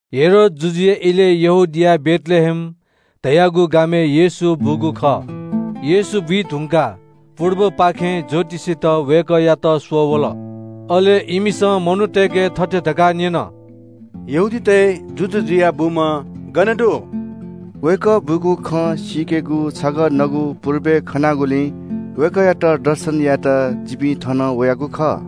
हेरोद जुजुया इलय्‌ यहूदियाया बेथलेहेम धाःगु गामय्‌ येशू बूगु खः। येशू बुइ धुंकाः पुर्बपाखें ज्‍योतिषीत वय्‌कःयात यरूशलेमय्‌ स्‍वः वल। अले इमिसं मनूतय्‌के थथे धकाः न्‍यन – “यहूदीतय्‌ जुजु जुयाः बूम्‍ह गन दु? वय्‌कः बूगु खँ सीकेगु छगः नगु पुर्बय्‌ खनागुलिं वय्‌कःयात दर्शन यायेत जिपिं थन वयागु खः।”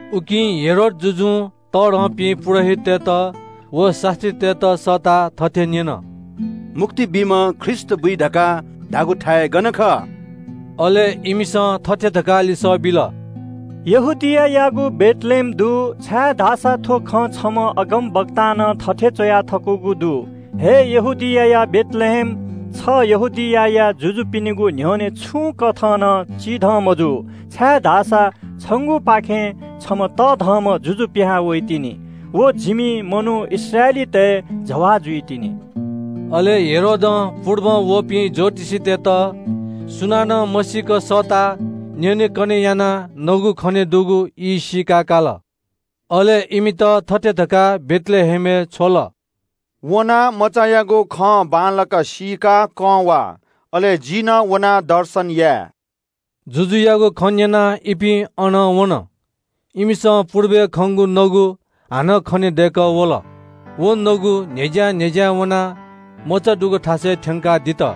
उकिं हेरोद जुजुं तःधंपिं पुजाहारीतय्‌त व शास्‍त्रीतय्‌त सःताः थथे न्‍यन – “मुक्ति बीम्‍ह ख्रीष्‍ट गन बुइगु?” अले इमिसं थथे धकाः लिसः बिल – “यहूदियायागु बेथलेहेमय्‌ दु, छाय्‌धाःसा थ्‍व खँ छम्‍ह अगमवक्तां नं थथे च्‍वया थकूगु दु – “‘हे यहूदियाया बेथलेहेम, छ यहूदियाया जुजुपिनिगु न्‍ह्यःने छुं कथं नं चिधं मजू, छाय्‌धाःसा छंगुपाखें छम्‍ह तःधंम्‍ह जुजु पिहां वइतिनि। व जिमि मनू इस्राएलीतय्‌ जवाः जुइतिनि।’” अले हेरोदं पुर्बं वःपिं ज्‍योतिषीतय्‌त सुनानं मसीक सःताः न्‍यनेकने यानाः नगु खनेदुगु ई सीका काल। अले इमित थथे धकाः बेथलेहेमय्‌ छ्वल – “छिकपिं वनाः मचायागु खँ बांलाक सीकाः जितः कं झासँ, अले जि नं वनाः दर्शन या वने।” जुजुयागु खँ न्‍यनाः इपिं अनं वन। इमिसं पुर्बय्‌ खंगु नगु हानं खने दय्‌कः वल। व नगु न्‍ह्यज्‍यां ज्‍यां वनाः मचा दुगु थासय्‌ थ्‍यंकाः दित।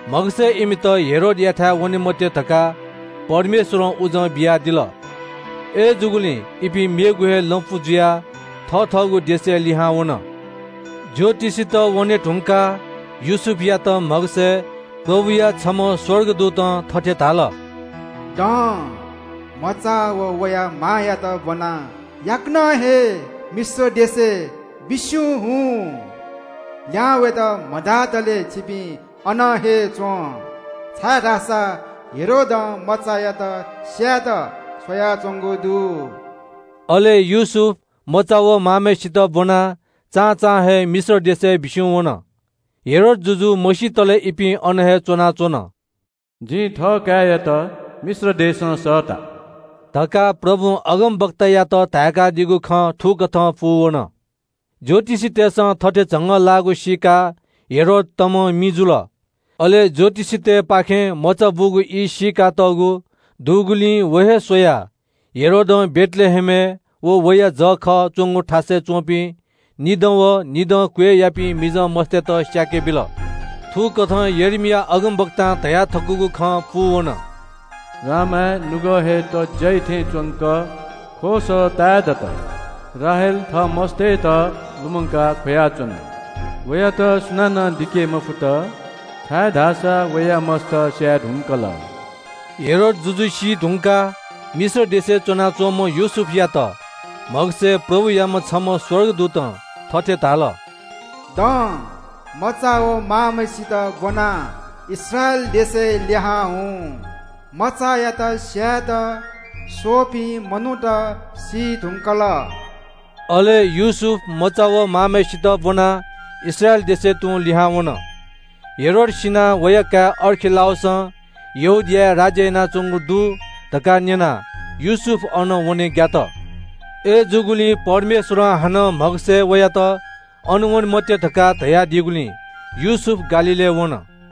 म्‍हगसय्‌ इमित हेरोदयाथाय्‌ वने मते धकाः परमेश्वरं उजं बियादिल। अय्‌जूगुलिं इपिं मेगु हे लँपु जुयाः थः थःगु देशय्‌ लिहां वन। ज्‍योतिषीत वने धुंकाः योसेफयात म्‍हगसय्‌ प्रभुया छम्‍ह स्‍वर्गदूतं थथे धाल – “दँ, मचा व वया मांयात ब्‍वनाः याकनं हे मिश्र देशय्‌ बिस्‍युं हुँ। लिहां वयेत मधातले छिपिं अन हे च्‍वँ, छाय्‌धाःसा हेरोदं मचायात स्‍यायेत स्‍वयाच्‍वंगु दु।” अले योसेफ मचा व मांम्‍हय्‌सित ब्‍वनाः चां चां हे मिश्र देशय्‌ बिस्‍युं वन। हेरोद जुजु मसितले इपिं अन हे च्‍वनाच्‍वन। “जिं थः काय्‌यात मिश्र देशं सःता” धकाः परमप्रभुं अगमवक्तायात धाय्‌कादीगु खँ थुकथं पूवन। ज्‍योतिषीतय्‌सं थथे झंगःलाःगु सीकाः हेरोद तमं मि जुल। अले ज्‍योतिषीतय्‌ पाखें नगु खनेदुगु ई सीकातःगु दुगुलिं व हे स्‍वयाः हेरोदं बेथलेहेमय्‌ व वया जःखः च्‍वंगु थासय्‌ च्‍वंपिं निदँ व निदं क्‍वय्‌यापिं मिजं मस्‍तय्‌त स्‍याके बिल। थुकथं यर्मिया अगमवक्तां धया थकूगु खँ पूवन – “रामाय्‌ नुगः हे तज्‍याइ थें च्‍वंक ख्‍वःसः ताये दत। राहेल थः मस्‍तय्‌त लुमंकाः ख्‍वयाच्‍वन। वयात सुनानं दिके मफुत, छाय्‌धाःसा वया मस्‍त स्‍याये धुंकल।” हेरोद जुजु सी धुंकाः मिश्र देशय्‌ च्‍वना च्‍वंम्‍ह योसेफयात म्‍हगसय्‌ प्रभुयाम्‍ह छम्‍ह स्‍वर्गदूतं थथे धाल – “दँ, मचा व मांम्‍हय्‌सित ब्‍वनाः इस्राएल देशय्‌ लिहां हुँ। मचायात स्‍यायेत स्‍वःपिं मनूत सी धुंकल।” अले योसेफ मचा व मांम्‍हय्‌सित ब्‍वनाः इस्राएल देशय्‌ तुं लिहां वन। हेरोद सिनाः वया काय्‌ अर्खिलाउसं यहूदियाय्‌ राज्‍य यानाच्‍वंगु दु धकाः न्‍यनाः योसेफ अन वने ग्‍यात। अय्‌जूगुलिं परमेश्वरं हानं म्‍हगसय्‌ वयात अन वने मते धकाः धयादीगुलिं योसेफ गालीलय्‌ वन।